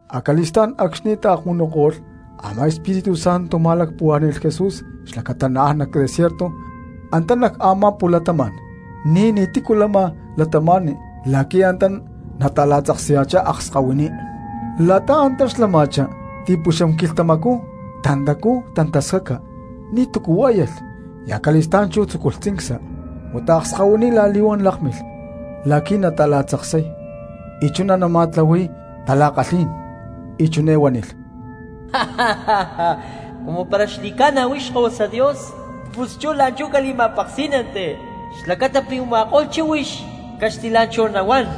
Acali̠stá̠n acxni̠ taakmunuko̠lh, a̠má Espíritu Santo ma̠lacpuhuá̠ni̠lh Jesús xlacata naán nac desierto antá nac a̠má pu̠latama̠n ní ni̠tícu lama cristianos la̠qui̠ antá nata̠la̠tzaksaya̠chá akskahuiní. La̠ta antá xlama̠chá ti̠puxam quilhtamacú tantacú tantascaca ni̠tu̠cu huá̠yalh, y acali̠stá̠n chú tzuculhá tzincsa. Huata akskahuiní la̠li̠huán lákmilh la̠qui̠ nata̠la̠tzaksay y chuná nama̠tlahui̠y tala̠kalhí̠n, y chiné huánilh: —Cumu para xli̠ca̠na huix Xkahuasa Dios, pus chú la̠nchú cali̠ma̠peksí̠nanti xlacata pi̠ u̠ma̠ko̠lh chíhuix caxtilá̠nchahu nahuán.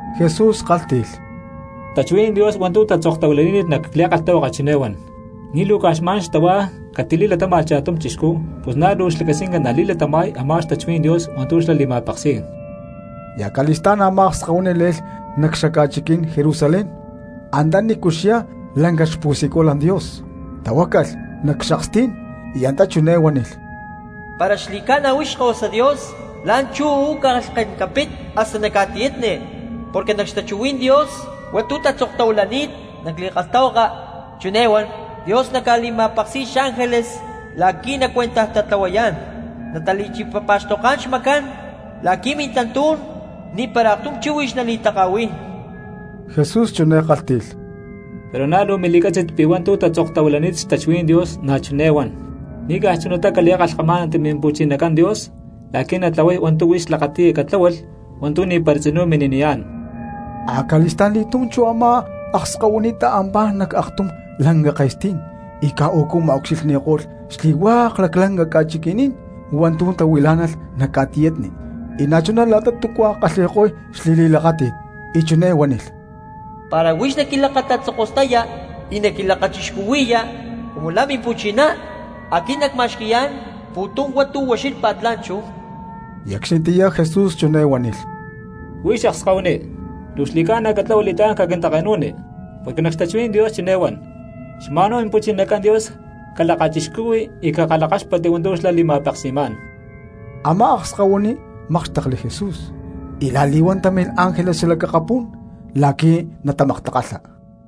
Jesús kálhti̠lh: —Xtachuhuí̠n Dios hua̠ntu̠ tatzoktahuilani̠t nac li̠kalhtahuaka chiné huan: “Ni̠ luu caj xma̠n xtahuá catili̠latáma̠lh cha̠tum cristiano, pus na̠ luu xlacasquinca nali̠latama̠y a̠má xtachuhuí̠n Dios hua̠ntu̠ xlá li̠ma̠peksi̠y.” Y acali̠stá̠n a̠má akskahuiní le̠lh nac xaca̠chiquí̠n Jerusalén antanícu xyá lanca xpu̠siculan Dios, tahuácalh nac xakstí̠n, y antá chiné huánilh: —Para xli̠ca̠na huix Xkahuasa Dios la̠nchú uú lhken capit hasta nac ca̠tiyatni, porque nac xtachuhuí̠n Dios hua̠ntu̠ tatzoktahuilani̠t nac li̠kalhtahuaka, chiné huán: Dios naca̠li̠ma̠peksi̠y xángeles la̠qui̠ nacuentajtatlahuayá̠n, natali̠chipapa̠xtoká̠n xmacancán la̠qui̠ mintantú̠n ni̠para aktum chíhuix nali̠taka̠hui̠y. Jesús chiné kálhti̠lh: —Pero na̠ luu mili̠cátzi̠t pi̠ hua̠ntu̠ tatzoktahuilani̠t xtachuhuí̠n Dios na̠ chiné huán: “Ni̠ caj chunatá cali̠kalhkamá̠nanti Mimpu̠chinacán Dios la̠qui̠ natlahuay hua̠ntu̠ huix lakati̠ya catláhualh hua̠ntu̠ ni̠para tzinú mini̠niyá̠n.” Acali̠sta̠nli̠túm chú a̠má akskahuiní ta̠ampá nac aktum lanca ke̠stí̠n y caj ucu ma̠ucxilhni̠ko̠lh xli̠hua̠k laclanca ca̠chiqui̠ní̠n hua̠ntu̠ tahuilá̠nalh nac ca̠tiyatni, y na̠chuná la̠ta túcua kalhi̠ko̠y xli̠li̠lakáti̠t. Y chiné huánilh: —Para huix naquilakatatzokostaya y naquilakachixcuhui̠ya cumu la̠ mimpu̠chiná, aquit nacma̠xqui̠yá̠n pu̠tum hua̠ntu̠ ucxílhpa̠t la̠nchú. Y acxnitiyá Jesús chiné huánilh: —Huix akskahuiní, luu xli̠ca̠na catlahua li̠tlá̠n caquintake̠nu̠ni, porque nac xtachuhuí̠n Dios chiné huán: “Xma̠nhuá Mimpu̠chinacán Dios calakachixcuhui y cakalhakáxpatti hua̠ntu̠ xlá li̠ma̠peksi̠má̠n.” Amá akskahuiní mákxtekli Jesús y la̠li̠huán támilh ángeles xalac akapú̠n la̠qui̠ natamaktakalha.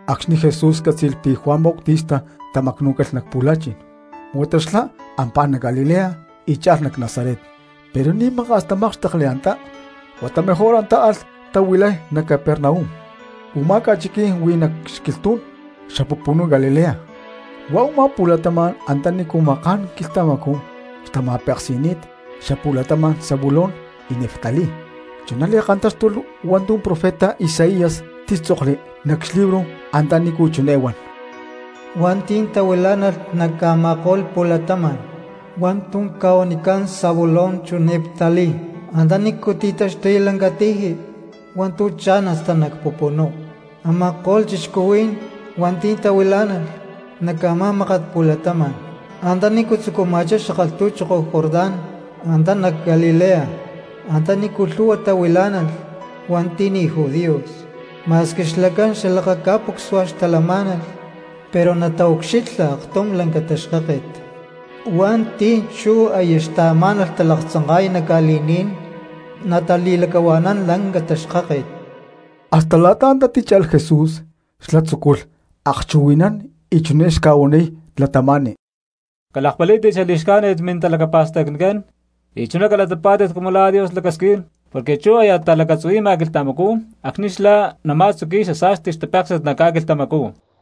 Acxni̠ Jesús cátzi̠lh pi̠ Juan Bautista tamacnú̠calh nac pu̠la̠chi̠n huata xlá ampá nac Galilea y cha̠lh nac Nazaret. Pero ni̠ maka̠s tamákxtekli antá, huata mejor antá alh tahuilay nac Capernaum. Umá ca̠chiquí̠n huí nac xquilhtú̠n xapupunú Galilea, huá u̠má pu̠latama̠n antanícu maká̠n quilhtamacú xtama̠peksi̠ni̠t xapu̠latama̠n Zabulón y Neftalí. Chuná li̠kantáxtulh hua̠ntu̠ profeta Isaías títzokli nac xlibro antanícu chiné huán: Hua̠nti̠ tahuilá̠nalh nac a̠ma̠ko̠lh pu̠latama̠n hua̠ntu̠ ca̠huanicán Zabulón chu Neftalí, antanícu ti̠taxtuy lanca̠tiji hua̠ntu̠ cha̠n hasta nac pupunú; a̠ma̠ko̠lh cristianos hua̠nti̠ tahuilá̠nalh nac a̠má mákat pu̠latama̠n antanícu tzucuma̠chá xakalhtu̠choko Jordán, antá nac Galilea antanícu lhu̠hua tahuilá̠nalh hua̠nti̠ ni̠ judíos; ma̠squi xlacán xalakaca̠pucsua xtalamá̠nalh pero nataucxilha aktum lanca taxkáket, y hua̠nti̠ chú aya xtaamá̠nalh talaktzanka̠y nac ca̠li̠ní̠n, natali̠lacahua̠nán lanca taxkáket. Hasta la̠ta antá tícha̠lh Jesús xlá tzúculh akchuhui̠nán y chiné xca̠huaniy cristianos: —Calakpalí̠tit xali̠xcájnit mintalacapa̠stacnicán y chuná calatapá̠tit cumu la̠ Dios lacasquín, porque chú aya talacatzuhui̠ma quilhtamacú acxni̠ xlá nama̠tzuqui̠y xasa̠sti xtapéksi̠t nac ca̠quilhtamacú.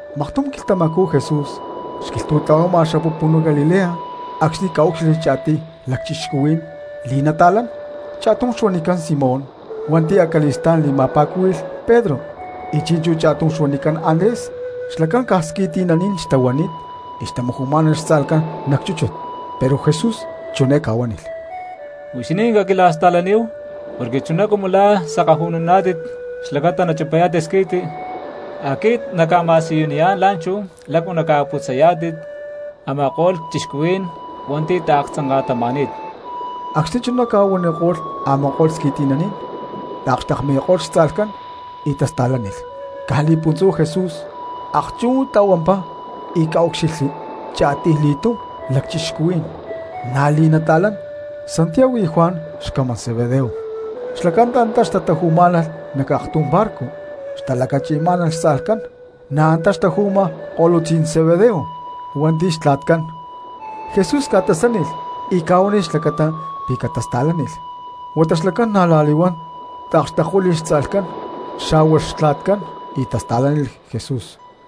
Maktum quilhtamacú Jesús xquilhtu̠tla̠huama xapupunú Galilea acxni̠ ca̠úcxilhli cha̠tiy lacchixcuhuí̠n li̠nata̠lán, cha̠tum xuanicán Simón hua̠nti̠ acali̠stá̠n li̠ma̠pa̠cúhui̠lh Pedro, y chi̠nchú cha̠tum xuanicán Andrés. Xlacán caj squi̠ti̠naní̠n xtahuani̠t y xtamaju̠má̠nalh xtza̠lhcán nac chúchut. Pero Jesús chiné ca̠huánilh: —Huixinín caquila̠sta̠laníhu porque chuná cumu lá sakaju̠nuná̠tit xlacata nachipayá̠tit squi̠ti, aquit nacca̠ma̠siyuniyá̠n la̠nchú lácu naca̠putzayá̠tit a̠ma̠ko̠lh cristianos hua̠nti̠ taaktzanka̠tama̠ni̠t. Acxni̠ chuná ca̠huaniko̠lh, a̠ma̠ko̠lh squi̠ti̠naní̠n taakxtekmi̠ko̠lh xtza̠lhcán y tasta̠lánilh. Caj li̠puntzú Jesús akchú tla̠huampá y ca̠úcxilhli cha̠tiyli̠tum lacchixcuhuí̠n na̠ li̠nata̠lán, Santiago y Juan xcamán Zebedeo. Xlacán antá xtataju̠má̠nalh nac aktum barco xtalacachi̠má̠nalh xtza̠lhcán; na̠ antá xtaju̠ma ko̠lutzí̠n Zebedeo hua̠nti̠ xtla̠tcán. Jesús ca̠tasánilh y ca̠huánilh xlacata pi̠ catasta̠lánilh. Huata xlacán na̠ la̠li̠huán taakxtekuíli̠lh xtza̠lhcán xa̠hua xtla̠tcán y tasta̠lánilh Jesús.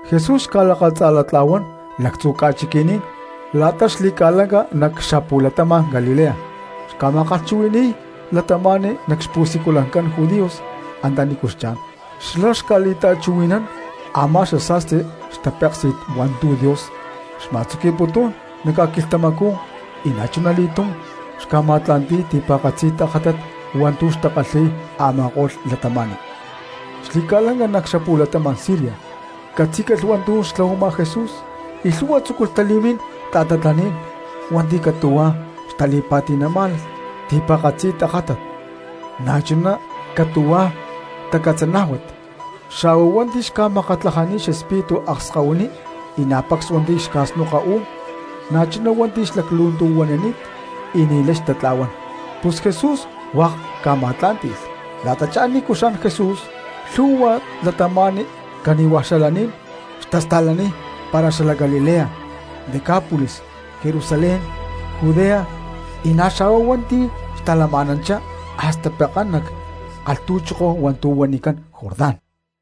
Jesús xca̠lakatza̠latla̠huán lactzu ca̠chiqui̠ní̠n la̠ta xli̠ca̠lanca nac xapu̠latama̠n Galilea, xca̠ma̠kalhchuhui̠ni̠y cristianos nac xpu̠siculancán judíos antanícu xchá̠n, xlá xca̠li̠ta̠chuhui̠nán a̠má xasa̠sti xtapéksi̠t hua̠ntu̠ Dios xma̠tzuqui̠putún nac ca̠quilhtamacú y na̠chuna li̠túm xca̠ma̠tla̠nti̠y ti̠pa̠katzi tajátat hua̠ntu̠ xca̠kalhi̠y a̠ma̠ko̠lh cristianos. Xli̠ca̠lanca nac xapu̠latama̠n Siria catzí̠calh hua̠ntu̠ xtlahuama Jesús y lhu̠hua cristianos tzúculh tali̠mín ta̠tatlaní̠n hua̠nti̠ catu̠huá xtali̠pa̠ti̠má̠nalh ti̠pa̠katzi tajátat, na̠ chuná catu̠hua̠ tacatzanájuat, na̠chuná hua̠nti̠ xca̠makatlajani̠t xespíritu akskahuiní, y na̠ pacs hua̠nti̠ xca̠snoka uú̠n, na̠chuná hua̠nti̠ xtalaclu̠ntu̠huanani̠t y ni̠lay xtatla̠huán. Pus Jesús hua̠k ca̠ma̠tlá̠nti̠lh. La̠tachá nícu xán Jesús, lhu̠hua cristianos cani̠hua xalaní̠n xtasta̠laniy para xalac Galilea, Decápolis, Jerusalén, Judea y na̠ xa̠huá hua̠nti̠ xtalama̠nanchá hasta pekán nac kalhtu̠choko hua̠ntu̠ huanicán Jordán.